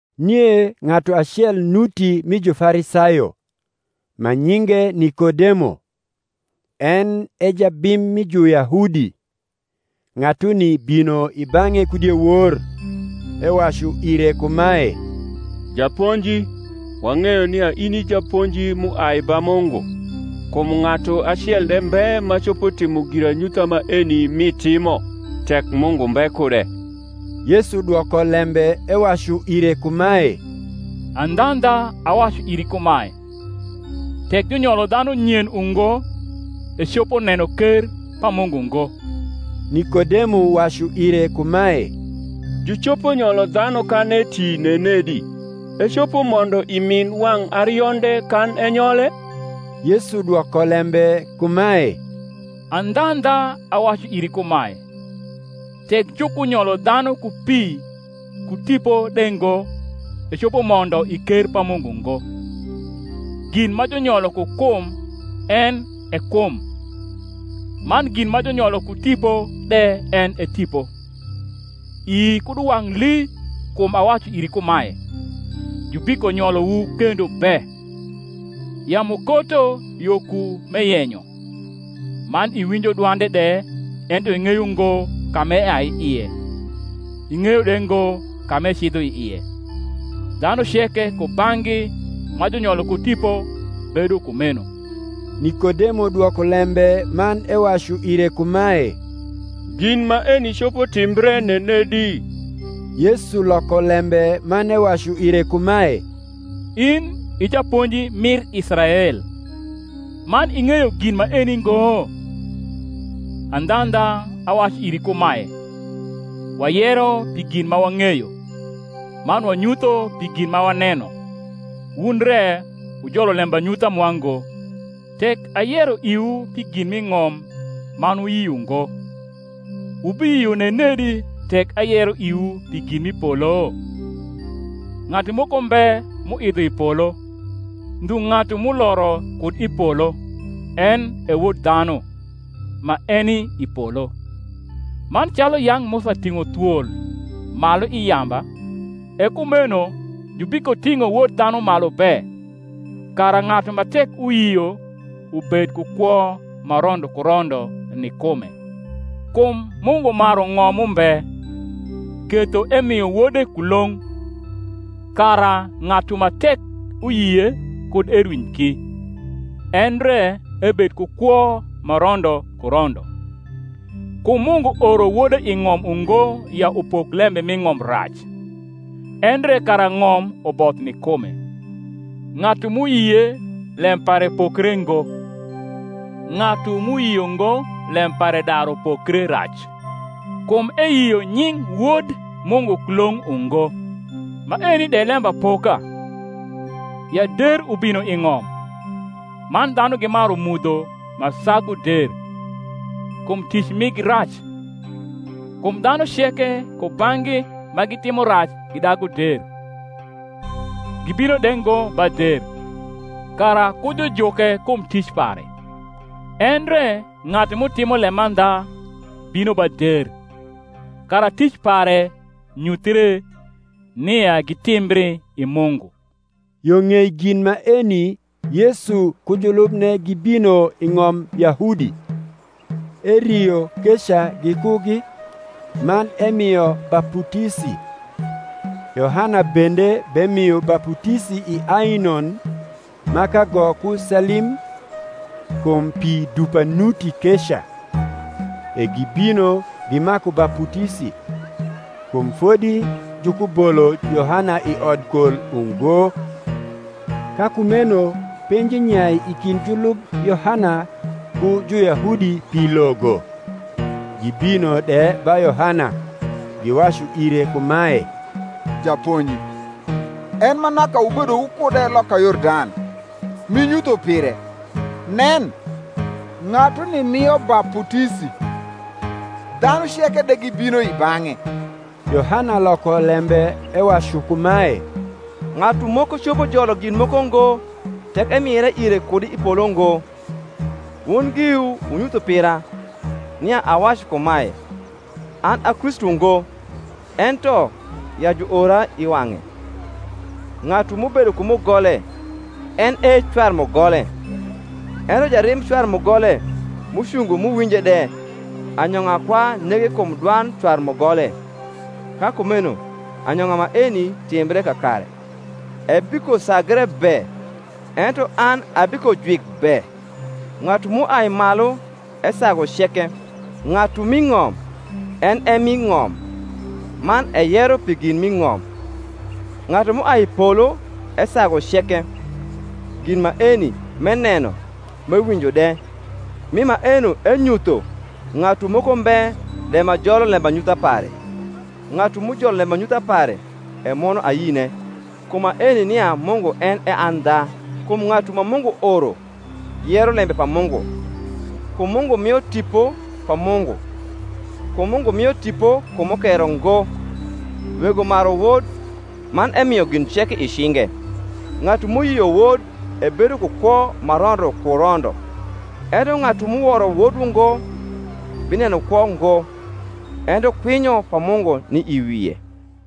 Nie ng’atu acel nuti mi Jufarisayo, ma nyinge Nikodemo, en e jabim mi Juyahudi: ng’atuni bino i bang’e ku diewor, ewacu ire kumae, Japonji, wang’eyo nia in i japonji m’uai ba Mungu: kum ng’atu acel de mbe ma copo timo giranyutha maeni m’itimo, tek Mungu mbe kude. Yesu dwoko lembe ewacu ire kumae, Andhandha, awacu iri kumae, Tek junyolo dhanu nyen ungo, ecopo neno ker pa Mungu ngo. Nikodemo wacu ire kumae, Jucopo nyolo dhanu kan eti nenedi? ecopo mondo i min wang’ arionde, kan enyole? Yesu dwoko lembe kumae, Andhandha, awacu iri kumae, Tek jukunyolo dhanu ku pi ku Tipo de ngo, ecopo mondo i ker pa Mungu ngo. Gin ma junyolo ku kum en e kum; man gin ma junyolo ku Tipo de en e tipo. Ii kud uwang’ lii kum awacu iri kumae, Jubikonyolowu kendo be. Yamu koto yo ku m’eyenyo, man iwinjo dwande de ento ing’eyo ngo ka m’eai i ie, ing’eyo de ngo ka m’ecidho i ie, dhanu ceke kubang’gi ma junyolo ku Tipo bedo kumeno. Nikodemo dwoko lembe man ewacu ire kumae, Gin maeni copo timbre nenedi? Yesu loko lembe man ewacu ire kumae, In i japonji mir Israel, man ing’eyo gin maeni ngo? Andhandha, awacu iri kumae, Wayero pi gin ma wang’eyo, man wanyutho pi gin ma waneno; wun re wujolo lembanyutha mwa ngo. Tek ayero iwu pi gin m’i ng’om man wuyio ngo, wubiyio nenedi tek ayero iwu pi gin m’i polo? Ng’atu moko mbe m’uidho i polo, ndhu ng’atu m’uloro kud i polo, en e Wod dhanu, ma eni i polo. Man calu yang’ Musa ting’o thwol malu i yamba, e kumeno jubikoting’o Wod dhanu malu be; kara ng’atu ma tek uyio ubed ku kwo ma rondo ku rondo ni kume. Kum Mungu maru ng’om mumbe, ketho emio Wode kulong’, kara ng’atu ma tek uyie kud erwiny ki, endre ebed ku kwo ma rondo ku rondo. Kum Mungu oro Wode i ng’om ungo ya upok lembe m’i ng’om rac; endre kara ng’om uboth ni kume. Ng’atu m’uyie lem pare pokre ngo: ng’atu m’uyio ngo lem pare daru pokre rac, kum eyio nying Wod Mungu kulong’ ungo. Maeni de lembapoka, ya der ubino i ng’om, man dhanu gimaru mudho ma sagu der; kum tic migi rac. Kum dhanu ceke kubang’gi ma gitimo rac gidagu der, gibino de ngo ba der, kara kujujuke kum ric pare. Endre ng’atu m’utimo lemandha bino ba der, kara tic pare nyuthie, nia gitimbri i Mungu. Yo ng’ei gin maeni Yesu ku julubne gibino i ng’om Yahudi; erio keca gikugi, man emio baputisi. Yohana bende bemio baputisi i Ainon ma kago ku Salim, kum pi dupa nuti keca: e gibino, gimaku baputisi. Kum fodi jukubolo Yohana i odkol ungo. Ka kumeno penji nyai i kind julub Yohana ku Juyahudi pi logo. Gibino de ba Yohana, giwacu ire kumae, Japonji, en ma naka wubedo wukude loka Yordan, m’inyutho pire, nen, ng’atuni mio baputisi, dhanu ceke de gibino i bang’e. Yohana loko lembe ewacu kumae, Ng’atu moko copo jolo gin moko ngo, tek emire ire kud i polo ngo. Wun giwu wunyutho pira, nia awacu kumae, An a Kristu ngo, ento, ya juora i wang’e. Ng’atu m’ubedo ku mugole en e cwar mugole: ento jarim cwar mugole, m’ucungo m’uwinje de, anyong’a kwa nege kum dwand cwar mugole: ka kumeno anyong’a maeni timbre kakare. Ebikosagre be, ento an abikojwik be. Ng’atu m’uai malu esagu ceke; ng’atu m’i ng’om en e m’i ng’om, man eyero pi gin m’i ng’om: ng’atu m’uai i polo esagu ceke. Gin maeni m’eneno m’ewinjo de, mi maeno enyutho; ng’atu moko mbe de ma jolo lembanyutha pare. Ng’atu m’ujolo lembanyutha pare emwono ayine kum maeni nia Mungu en e andha. Kum ng’atu ma Mungu oro yero lembe pa Mungu: kum Mungu mio Tipo pa Mungu: kum Mungu mio Tipo ku mukero ngo. Wego maru Wod, man emio gin ceke i cinge. Ng’atu m’uyio Wod ebedo ku kwo ma rondo ku rondo; ento ng’atu m’uworo Wod ungo bineno kwo ngo, ento kwinyo pa Mungu ni i wie.